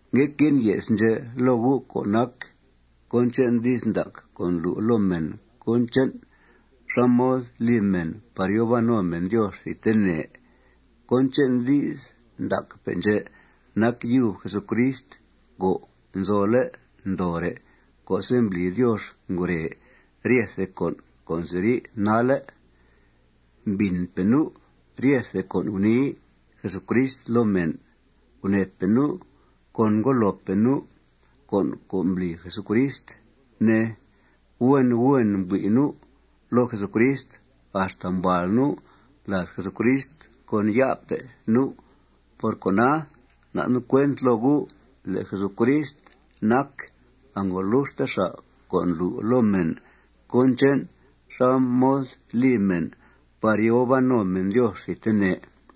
Ngue que'en ye's ndxè' loo gu' co' nac cón che'n di's ndac co' ndlu' loo mèn cón che'n xá mod li mèn par yòo ban no mèn Diox thidtene. Cón che'n di's ndacpe' ndxè' nac yub Jesucrist co' nzole' ndoore' co'se' mbli Diox ngure ryethe con' co' nziri' nalle'. Mbìnpe' nu' ryethe con' gunii Jesucrist loo mèn. Gunèepe' nu' con ngudloope' nu' con' co' mbli Jesucrist, ne. Huen huen mbui' nu' loo Jesucrist axta mbuàal nu' lad Jesucrist con ya'pe' nu'. Por cona, nda' nu' cuent loo gu' le' Jesucrist nac angoluxte xa' co' ndlu' loo mèn cón che'n xá mod li mèn par yòo ban no mèn Diox thidtene.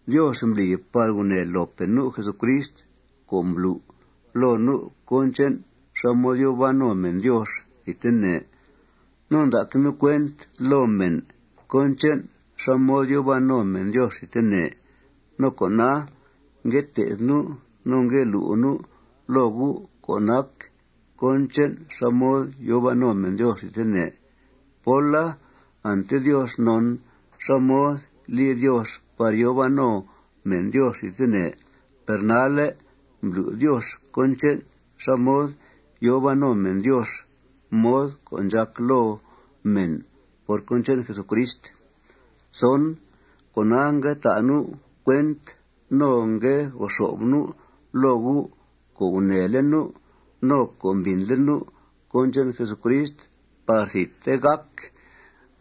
Diox mbli par gunèe loope' nu' Jesucrist co' mblu' loo nu' cón che'n xá mod yòo ban no mèn Diox thidtene. No nda'que' nu' cuent loo mèn cón che'n xá mod yòo ban no mèn Diox thidtene. No cona, ngue te'th nu' no ngue lu' nu' loo gu' co' nac cón che'n xá mod yòo ban no mèn Diox thidtene. Póla, ante Diox non xá mod li Diox par yòo ban no mèn Diox thidtene. Per nalle', mblu' Diox cón che'n xá mod yòo ban no mèn Diox, mod co' ndxàc loo mèn por cón che'n Jesucrist. Cona, ngue ta' nu' cuent no ngue go xo'f nu' loo gu' co' gunèele' nu' no co' mbìnle' nu' cón che'n Jesucrist par thidte gàc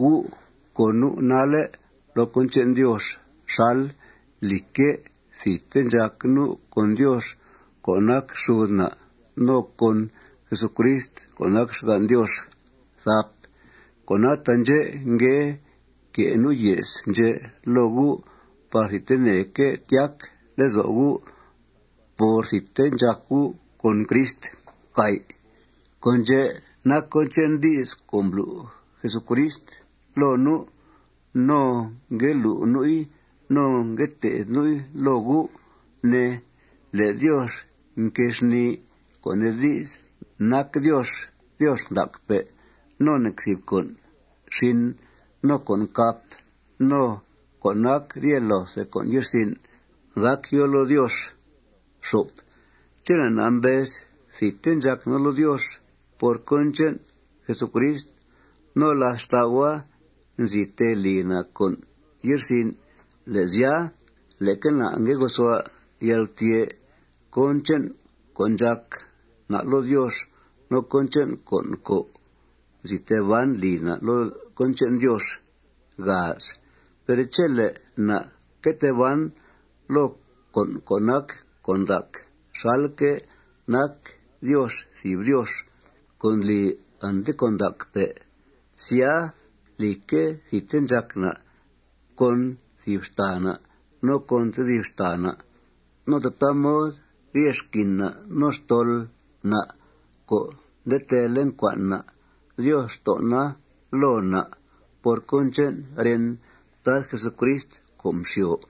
gu' con nu' nalle' loo cón che'n Diox xal, lìcque', thidte ndxàc nu' con Diox co' nac xud na' no con Jesucrist co' nac xgan' Diox. Cona, taandxè' ngue que' nu' ye's ndxè' loo gu' par thidteneque' tyac lezo' gu' por thidte ndxàc gu' con Crist. Con' ndxè' nac cón che'n di's co' mblu' Jesucrist loo nu' no ngue lu' nu'i no ngue te'th nu'i loo gu', ne, le' Diox nquée xnìi, co' nee di's, nac Diox Diox ndacpe' no nec thìb con' xin no con' cap no co' nac rye loothe con' ye'rsin' gác yòo loo Diox. Chele' na' mbez thidte ndxàc na' loo Diox por cón che'n Jesucrist no, làth xtau'a, nzi tee li na' con' ye'rsin', le' sya, leque na' ngue gosua' yalgutyè' cón che'n co' ndxàc na' loo Diox no cón che'n con' co' nzi tee ban li na' loo cón che'n Diox. Per chele' na' que tee ban loo con' co' nac con' ndac xalque' nac Diox thìb Diox co' ndli ante con' ndacpe', sya, lìcque', thidte ndxàc na' con thìb xtàa na' no con tedib xtàa na'. No tataa mod rye xquin na' no xtol na' co' nde teele' ncua'n na', Diox nton'a loo na' por cón che'n ren Tad Jesucrist co' mxyo.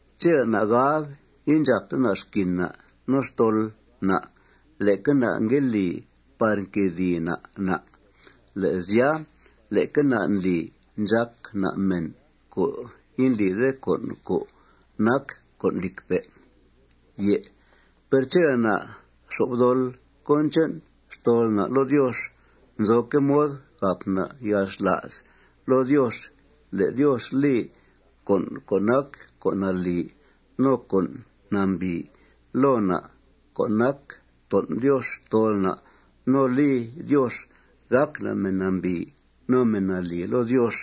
Chele' na' gab indxàpte na' xquin na' no xtol na', leque na' ngue li par nquedìi na' na'. Le' sya, leque na' ndli ndxàc na' mèn co' indlide con' co' nac con' lìcpe'. Per chele' na' xop dol cón che'n xtol na' loo Diox, nzoque' mod gàp na' yalxla's loo Diox le' Diox li con' co' nac con' nalì no con' nambìi loo na' co' nac ton' Diox xtol na' no li Diox gàc na' mèn nambìi no mèn nalì loo Diox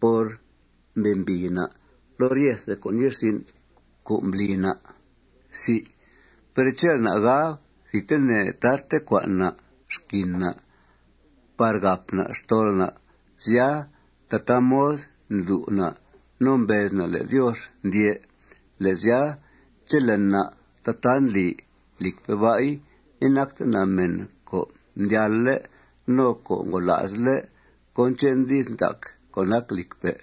por mbembìi na' loo ryethe con' ye'rsin' co' mbli na'. Per chele' na' gab thidtene tarte cua'n na' xquin na' par gàp na' xtol na', sya, tataa mod ndlu' na' no mbez na' le' Diox ndyè'. Le' sya, chele' na' tataa ndli, lìcpe' ba'i, inacte na' mèn co' mdyalle' no co' ngola'sle' cón che'n di's ndac co' nac lìcpe'.